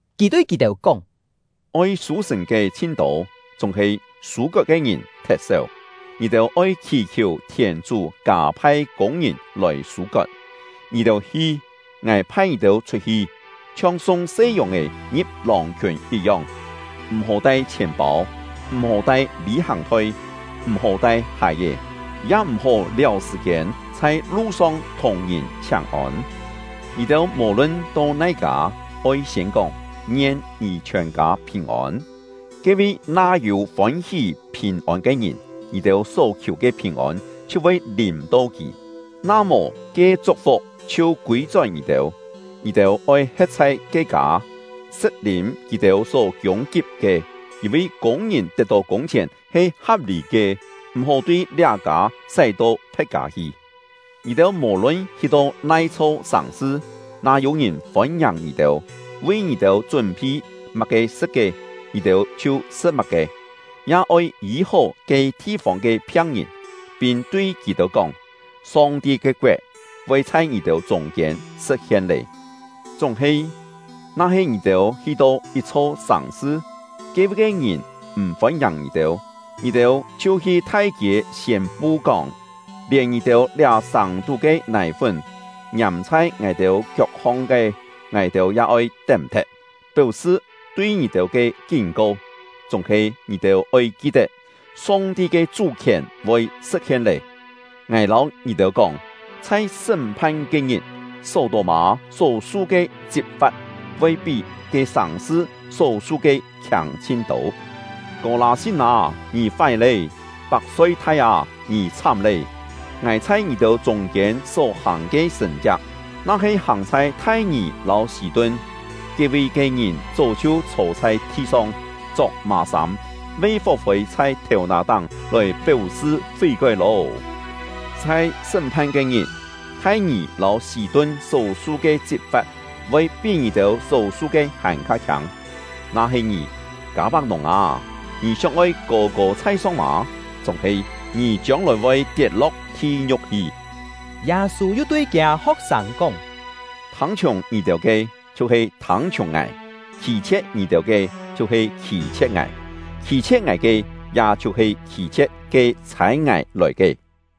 Kì tui kì-têu kóng: “Oi sû-sṳ̀n ke chhin-tô, chúng-he sû-kot ke ngìn thet-séu. Ngì-têu oi khì-khiù thièn-chú kâ-phai kûng-ngìn lòi sû-kot. Ngì-têu hi! Ngài phai ngì-têu chhut-hi, chhiong sung se yòng-è ngi̍p lòng-khiùn yit-yong. M̀-hó tai chhièn-pâu, m̀-hó tai lî-hàng-thoi, m̀-hó tai hài-è, ya m̀-hó liáu sṳ̀-kiên chhai lu-song thùng ngìn chhiáng-ôn. Ngì-têu mò-lun to nai-kâ, oi siên kóng: ‘Ngien ngì chhiòn-kâ phìn-ôn!’ Ke-vi na yû fôn-hí phìn-ôn ke ngìn, ngì-têu só khiù ke phìn-ôn chhiu voi lìm-to kì; na mò, ke chuk-fuk chhiu kûi-chón ngì-têu. Ngì-têu oi he̍t chhai ke kâ, sṳ̍t-lîm kì-têu só kiûng-kip ke, yîn-vi kûng-ngìn tet kûng-chhièn he ha̍p-lî ke; m̀-hó tui liá kâ sái-to phe̍t kâ hi. Ngì-têu mò-lun hi-to nai-chho sàng-sṳ, na yû-ngìn fôn-ngiàng ngì-têu, vi ngì-têu chún-phi má-ke sṳ̍t ke, ngì-têu chhiu sṳ̍t má-ke; ya oi yî-hó ke thi-fông ke phiang-ngìn, pin tui kì-têu kóng: ‘Song-ti ke koet voi chhai ngì-têu chûng-kiên sṳ̍t-hien lé!’ Chúng-he, na-he ngì-têu hi-to yit-chho sàng-sṳ, ke-vi ke ngìn m̀ fôn-ngiàng ngì-têu, ngì-têu chhiu hi thai-kiê siên-pu kóng: ‘Lièn ngì-têu liá sàng-tú ke nài-fún, ngiàm chhai ngài-têu kiok-hong ke, ngài-têu ya oi tém-thet, péu-sṳ tui ngì-têu ke kín-ko. Chúng-he ngì-têu oi ki-tet, Song-ti ke chú-khièn voi sṳ̍t-hien lé!’ Ngài lâu ngì-têu kóng, chhai sṳ́m-phan ke-ngit, Só-tô-mâ só-su ke chit-fa̍t voi pí ke sàng-sṳ só-su ke khiâng chhin-tô! “Kô-lâ-sin â, ngì fái lé! Pak-soi-thai â, ngì chhám lé! Ngài chhai ngì-têu chûng-kiên só hàng ke sṳ̀n-chiak, na-he hàng chhai Thai-ngì lâu Sî-tun, ke-vi ke ngìn chó chhiu chhô chhai thi-song, chok mà-sâm, ve fó-fôi chhai thèu-nà-táng lòi péu-sṳ fí-kói lô! Chhai sṳ́m-phan ke-ngit, Thai-ngì lâu Sî-tun só-su ke chit-fa̍t voi pí ngì-têu só-su ke hàn-kha khiâng! Na-he ngì, Kâ-pak-nùng â, ngì sióng-oi kô-kô chhai-song mâ? Chúng-he, ngì chiông-lòi voi tiet-lo̍k thi-ngiu̍k hi!” Yâ-sû yu tui kiâ ho̍k-sâng kóng: “Thâng-chhiùng ngì-têu ke, chhiu-he thâng-chhiùng ngài; khî-chhie̍t ngì-têu ke, chhiu-he khî-chhie̍t ngài; khî-chhie̍t ngài ke, ya chhiu-he khî-chhie̍t ke chhâi ngài lòi ke.”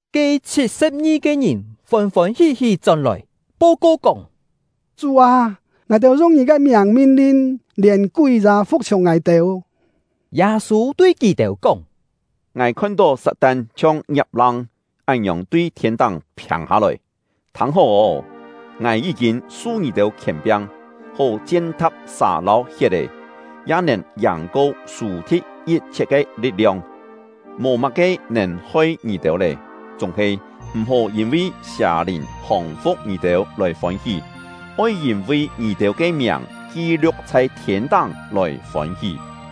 Ke chhit-sṳ̍p-ngi-ke ngìn fôn-fôn hí-hí chón-lòi, po-ko kóng: “Chú â! Ngài-têu yung ngì ke miàng min-lin, lièn kúi ya fu̍k-chhiùng ngài-têu!” Yâ-sû tui kì-têu kóng: “Ngài khon-tó Sat-tan chhiong ngiap-lang án-ngiòng tui thiên-táng phiâng-hâ-lòi. Thâng-hó ô! Ngài yí-kîn su ngì-têu khièn-piang, hó chien-tha̍p sà lâu hiet-è, ya nèn yàng-ko sù-thi̍t yit-chhiet ke li̍t-liong; mò má-ke nèn hoi ngì-têu lé. Chúng-he, m̀-hó yîn-vi sià-lìn hòng-fu̍k ngì-têu lòi fôn-hí; oi yîn-vi ngì-têu ke miàng ki-liu̍k chhai thiên-táng lòi fôn-hí.”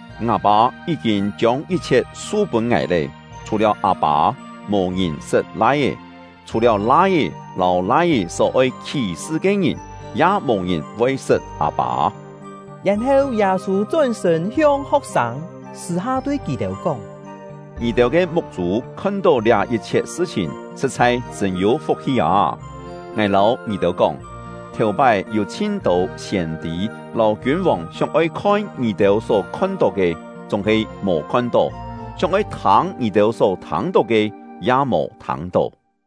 “Ngâ Pâ yí-kîn chiông yit-chhiet su-pûn ngài lé! Chhù-liáu Â-pâ, mò-ngìn sṳt Lai-é; chhù-liáu Lai-é lâu Lai-é só oi khí-sṳ ke ngìn, ya mò-ngìn voi sṳt Â-pâ.” Yèn-heu, Yâ-sû chón-sṳ̂n hiong ho̍k-sâng, sṳ̂-ha tui kì-têu kóng: “Ngì-têu ke muk-chû khon-tó liá yit-chhiet sṳ-chhìn, sṳ̍t-chhai chṳ̂n-yû fuk-hi â! Ngài lâu ngì-têu kóng, thèu-pái yû chhin-tô siên-tî lâu kiûn-vòng sióng-oi khon ngì-têu só khon-tó ke, chúng-he mò khon-tó; sióng-oi thâng ngì-têu só thâng-tó ke, ya mò thâng-tó.”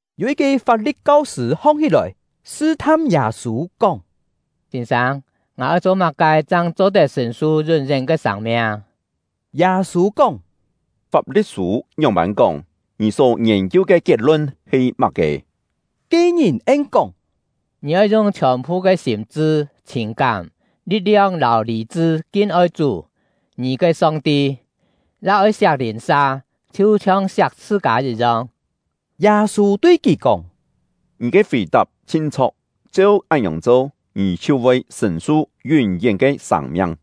Yû yit-ke Fap-li̍t kau-sṳ̂ hong-hí-lòi sṳ-tham Yâ-sû, kóng: “Sîn-sâng, ngài oi cho má-ke chang cho-tet sṳ̀n-su yún-yén ke sâng-miang?” Yâ-sû kóng: “Fap-li̍t-sû ngióng-pân kóng? Ngì só ngiên-kiu ke kiet-lun he má-ke?” Ke-ngìn en-kóng: “Ngì oi yung chhiòn-phu ke sîm-chṳ, chhìn-kám, li̍t-liong lâu lî-chṳ kin-oi Chú — ngì ke Song-ti; ya oi siak lìn-sa, chhiu-chhiong siak chhṳ-kâ yit-yong.” Yâ-sû tui kì kóng: “Ngì ke fì-tap chhin chho̍k, cheu án-ngiòng cho, ngì chhiu voi sṳ̀n-su yún-yén ke sâng-miang.”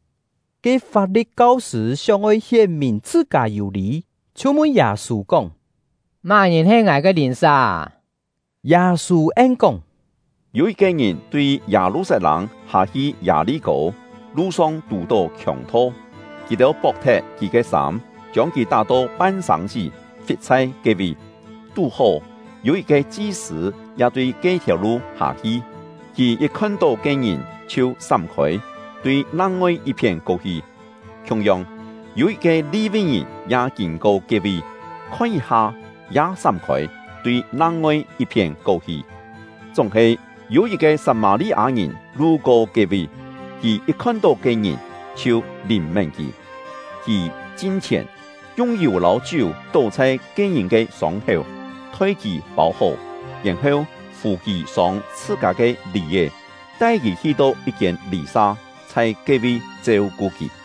Ke Fap-li̍t kau-sṳ̂ sióng-oi hién-mìn chhṳ-kâ yû lî, chhiu mun Yâ-sû kóng: “Má-ngìn he ngài ke lìn-sa â?” Yâ-sû en-kóng: “Yû yit-ke ngìn tui Yâ-lu-sat-lâng hâ-hi Yâ-li-kô, lu-song tù-tó khiòng-tho. Kì-têu pok-thet kì ke sâm, chiông kì tá-to pan-sâng-sí, fit chhai ke-vi. Tú-hó, yû yit-ke chi-sṳ̂ ya tui ke-thiàu lu hâ-hi; kì yit khon-tó ke-ngìn, chhiu sám-khôi, tui nang-ngoi yit-phién ko-hi. Khiung-yong, yû yit-ke Li-vi-ngìn ya kîn-ko ke-vi, khon yit-ha, ya sám-khôi, tui nang-ngoi yit-phién ko-hi. Chúng-he, yû yit-ke Sat-mâ-li-â-ngìn lu-ko ke-vi; kì yit khon-tó ke-ngìn, chhiu lìn-mén kì. Kì chin-chhièn, yung yù lâu chiú tó chhai ke-ngìn ke sông-héu, thoi kì pâu-hó, yèn-heu fù kì sông chhṳ-kâ ke lì-è, tai kì hi-to yit-kiên lî-sa, chhai ke-vi cheu-ku kì.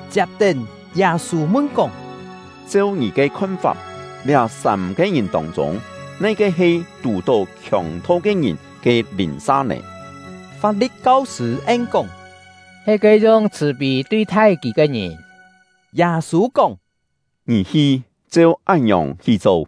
Chiap-tén, Yâ-sû mun-kóng: “Cheu ngì ke khon-fap, liá sâm-ke ngìn tông-chûng, nai-ke he tù-tó khiòng-tho ke ngìn ke lìn-sa nè?” Fap-li̍t kau-sṳ̂ en-kóng: “He ke yung chhṳ̀-pî tui-thai kì ke ngìn.” Yâ-sû kóng: “Ngì hi, cheu án-ngiòng hi cho!”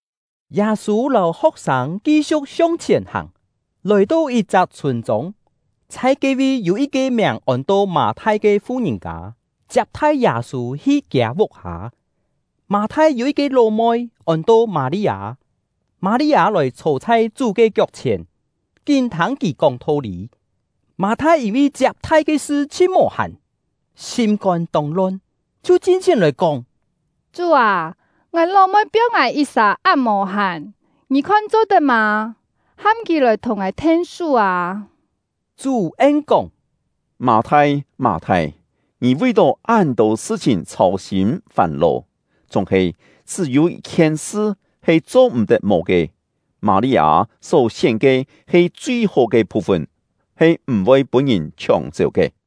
Yâ-sû lâu ho̍k-sâng ki-siu̍k hiong-chhièn hàng, lòi-to yit-chak chhûn-chông. Chhai ke-vi yû yit-ke miàng ôn-to Mâ-thai ke fu-ngìn-kâ, chiap-thai Yâ-sû hi kiâ vuk-hâ. Mâ-thai yû yit-ke ló-moi, ôn-to Mâ-li-â. Mâ-li-â lòi chhô chhai Chú ke kiok-chhièn, kín thâng kì kóng tho-lî. Mâ-thai yîn-vi chiap-thai ke sṳ chhin mò-hàn, sîm-kôn tông lon, chhiu chin-chhièn lòi kóng: “Chú â, ngài ló-moi piong ngài yit-sà án mò-hàn, ngì khon cho-tet mâ? Ham kì lòi thùng ngài then-sú â!” Chú en-kóng: “Mâ-thai, Mâ-thai, ngì vi-tó án-tô sṳ-chhìn chhâu-sîm fàn-lò, chúng-he chṳ́-yû yit-khien sṳ he cho-m̀-tet mò ke. Mâ-li-â só-sién ke he chui-hó ke phu-fun, he m̀-voi pûn-ngìn chhióng-chéu ke.”